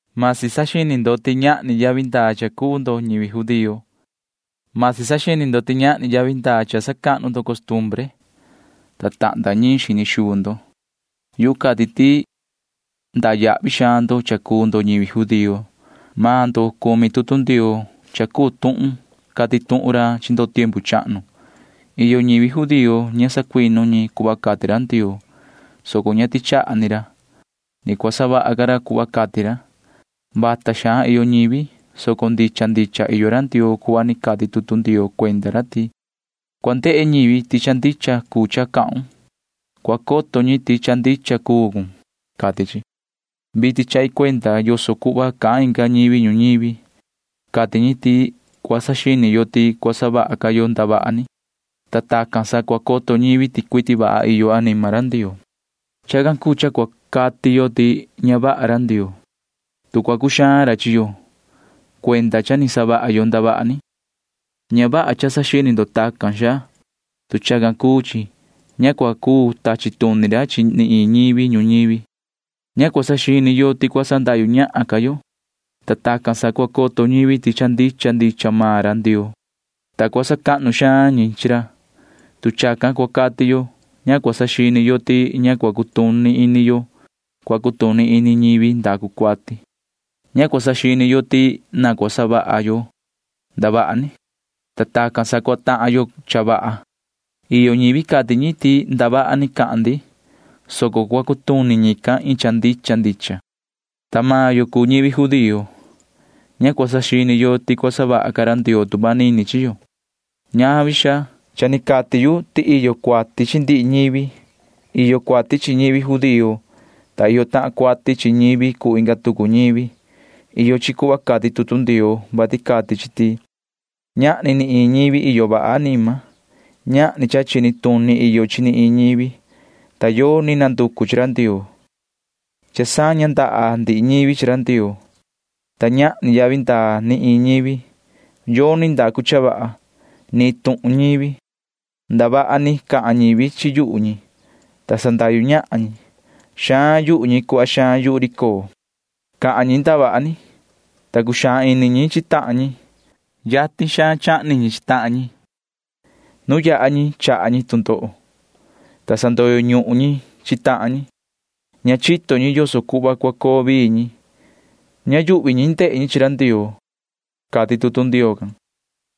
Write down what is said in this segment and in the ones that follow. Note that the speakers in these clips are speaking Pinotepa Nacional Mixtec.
Vasi saxini ndo ti ñahni yavi ndaa cha cuu ndo ñivi judío. Vasi saxini ndo ti ñahni yavi ndaa cha sacahnu ndo costumbre, ta tahnda ñiin xini xuu ndo. Yu cati ti iyo xaan yavi ndaa cha cuu ndo ñivi judío. Maan ndo cumi tutu Ndioo cha cuu tuhun cati tuhun ra chi ndo tiempu chahnu. Iyo ñivi judío ña sacuinu ñi cuhva cati ra Ndioo, soco ña tichaha ni ra. Ni cua savaha ra cuhva ni cati ra. Vasi vata xaan iyo ñivi, soco ndicha ndicha iyo ra Ndioo cuhva ni cati tutu Ndioo cuenda ra ti: Cua ndehe ñivi ti cha ndicha cuu cha cahun. Cua coto ñi ti cha ndicha cuun, cati chi. Vitin chahi cuenda yoso cuhva cahan inga ñivi ñuñivi. Cati ñi ti cua saxini yo ti cua savaha ca yo ndavaha ni, ta tacan sa cua coto ñivi ti cuiti vaha iyo anima ra Ndioo. Chacan cuu cha cua cati yo ti ña vaha ra Ndioo, tu cua cuxaan ra chi yo [cuenda cha ni savaha yo ndavaha ni]. Ña vaha cha saxini ndo tacan, xaa. Tu chacan cuu chi, ña cua cuu tachi tuni ra chi ni iin ñivi ñuñivi. Ña cua saxini yo ti cua sandahyu ñahan ca yo, ta tacan sa cua coto ñivi ti cha ndicha ndicha maan ra Ndioo, ta cua sacahnu xaan ñi chi ra. Tu chacan cua cati yo, ña cua saxini yo ti ña cua cutuni yo cuhva cua cutuni ñivi ndacu cuati. Ña cua saxini yo ti na cua savaha yo ndavaha ni, ta tacan sa cua tahan yo cha vaha. Iyo ñivi cati ñi ti ndavaha ni can cahan maan ndi, soco cua cutuni ñican iin cha ndicha ndicha. Ta maan yo cuu ñivi judío―ña cua saxini yo ti cua savaha ca ra Ndioo tu manini chi yo. Ñavi, xaa. Cha ni cati yu ti iyo cuati chi ndihi ñivi. Iyo cuati chi ñivi judío, ta iyo tahan cuati chi ñivi cuu inga tucu ñivi. Iyo chi cuhva cati tutu Ndioo, vati cati chi ti: Ñahni ni iin ñivi iyo vaha anima. Ñahni cha chini tuni iyo chi ni iin ñivi, ta yoni nanducu chi ra Ndioo. Cha saña ndaha ndihi ñivi chi ra Ndioo, ta ñahni yavi ndaa ni iin ñivi. Yoni ndacu cha vaha―ni iin tuhun ñivi. Ndavaha ni cahan ñivi chi yuhu ñi, ta sandahyu ñahan ñi. Xaan yuhu ñi cuhva xaan yuhu ri coo. Cahan ñi ndavaha ni, ta cuxaan ini ñi chi tahan ñi. Yatin xaan chahni ñi chi tahan ñi. Nu yaha ñi chaha ñi tu ndoho, ta sandoyo ñuhun ñi chi tahan ñi. Ña chito ñi yoso cuhva cua coo vii ñi. Ña yuhvi ñi ndehe ñi chi ra Ndioo, cati tutu Ndioo can.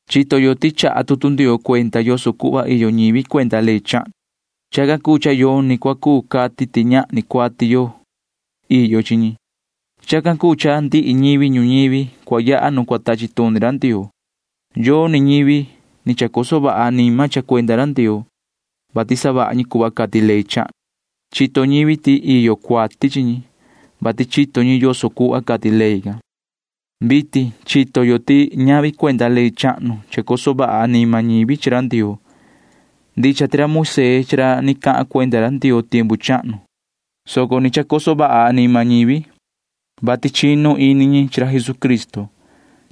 Chito yo ti chaha tutu Ndioo cuenda yoso cuhva iyo ñivi cuenda ley chahnu. Chacan cuu cha yoni cua cuu cati ti ñahni cuati iyo chi ñi. Chacan cuu cha ndihi ñivi ñuñivi cua yaha nu cua tachi tuni ra Ndioo. Yoni ñivi ni chacoso vaha anima cha cuenda ra Ndioo, vati savaha ñi cuhva cati ley chahnu. Chito ñivi ti iyo cuati chi ñi, vati chito ñi yoso cuhva cati ley can. Vitin chito yo ti ñavi cuenda ley chahnu chacoso vaha anima ñivi chi ra Ndioo. Ndicha ti ra Moisee chi ra ni cahan cuenda ra Ndioo chaha cuenda tiempu chahnu, soco ni chacoso vaha anima ñivi, vati chinu ini ñi chi ra Jesucristo.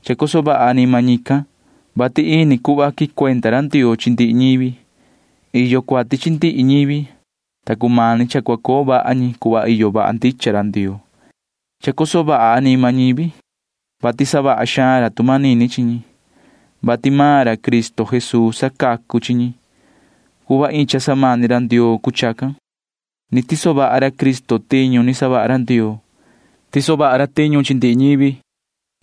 Chacoso vaha anima ñican, vati ini cuhva quicuenda ra Ndioo chi ndihi ñi. Iyo cuati chi ndihi ñivi, ta cumani cha cua coo vaha ñi cuhva iyo vaha ndicha ra Ndioo. Chacoso vaha anima ñivi, vati savaha xaan ra tu manini chi ñi, vati maan ra Cristo Jesuu sacacu chi ñi. Cuhva iin cha samani ra Ndioo cuu chacan. Ni tiso vaha ra Cristo tiñu ni savaha ra Ndioo. Tiso vaha ra tiñu chi ndihi ñivi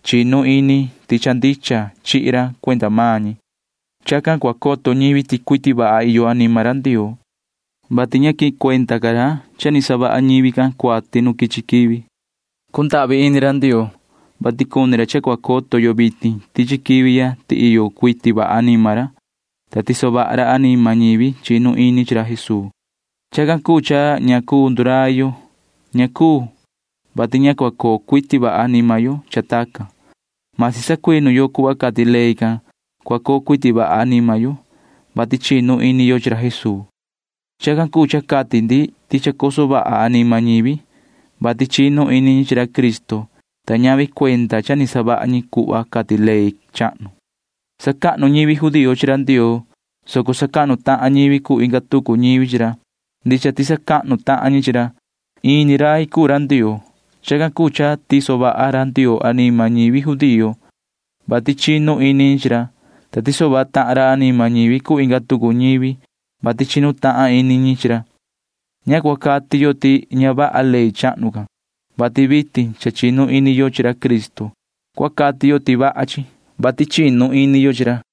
chinu ini ti cha chihi ra cuenda maan ñi. Chacan ni cua coto ñivi ti cuiti vaha iyo anima ra Ndioo, vati ña quicuenda ca ra cha ni savaha ñivi can cuati nu quichi quivi. Cundahvi ini ra Ndioo, vati cuni ra cha cua coto yo vitin tichi quivi ya ti iyo cuiti vaha anima ra, ta tiso vaha ra anima ñivi chinu ini chi ra Jesuu. Chacan cuu cha ña cuu ndurai yo. Ña cuu, vati ña cua coo cuiti vaha anima yo cha tacan―masi sacuinu yo cuhva cati ley can. Cua coo cuiti vaha anima yo, vati chinu ini yo chi ra Jesuu. Chacan cuu cha cati ndi ti chacoso vaha anima ñivi, vati chinu ini ñi chi ra Cristo, ta ñavi cha cuenda ni savaha ñi cuhva cati ley chahnu. Sacahnu ñivi judío chi ra Ndioo, soco sacahnu tahan ñivi cuu inga tucu ñivi chi ra. Ndicha ti sacahnu tahan ñi chi ra. Iin ni rai cuu ra Ndioo. Chacan cuu cha tiso vaha ra Ndioo anima ñivi judío, vati chinu ini ñi chi ra, ta tiso vaha tahan ra anima ñivi cuu inga tucu ñivi, vati chinu tahan ini ñi chi ra. Ña cua cati yo ti ña vaha ley chahnu can, vati vitin cha chinu ini yo chi ra Cristo. Cua cati yo ti cha iyo vaha chi, vati chinu ini yo chi ra.